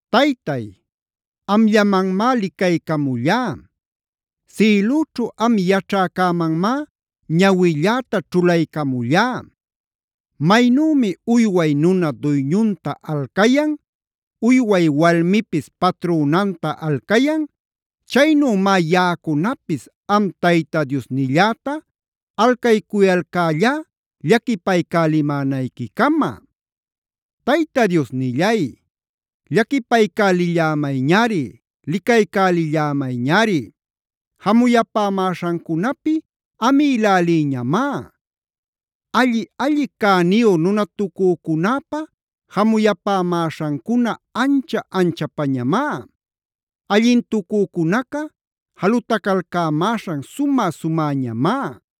Taytay, amllamanmá licaycamullá. Sïlüćhu am yaćhäcämanmá ñawilläta ćhulaycamullá. Maynümi uyway nuna duyñunta alcayan, uyway walmipis patrünanta alcayan, chaynümá yaꞌacunapis am Tayta Diosnilläta alcaycuyalcällá llaquipaycälimänayquicama. Tayta Diosnillay, llaquipaycälillämayñari, licaycälillämayñari. Jamuyapämäśhancunapi amïlälïñamá. Alli-alli cäniyu nunatucücunäpa jamuyapämäśhancuna ancha-anchapañamá. Allintucücunaca jalutacalcämäśhan sumä-sumäñamá.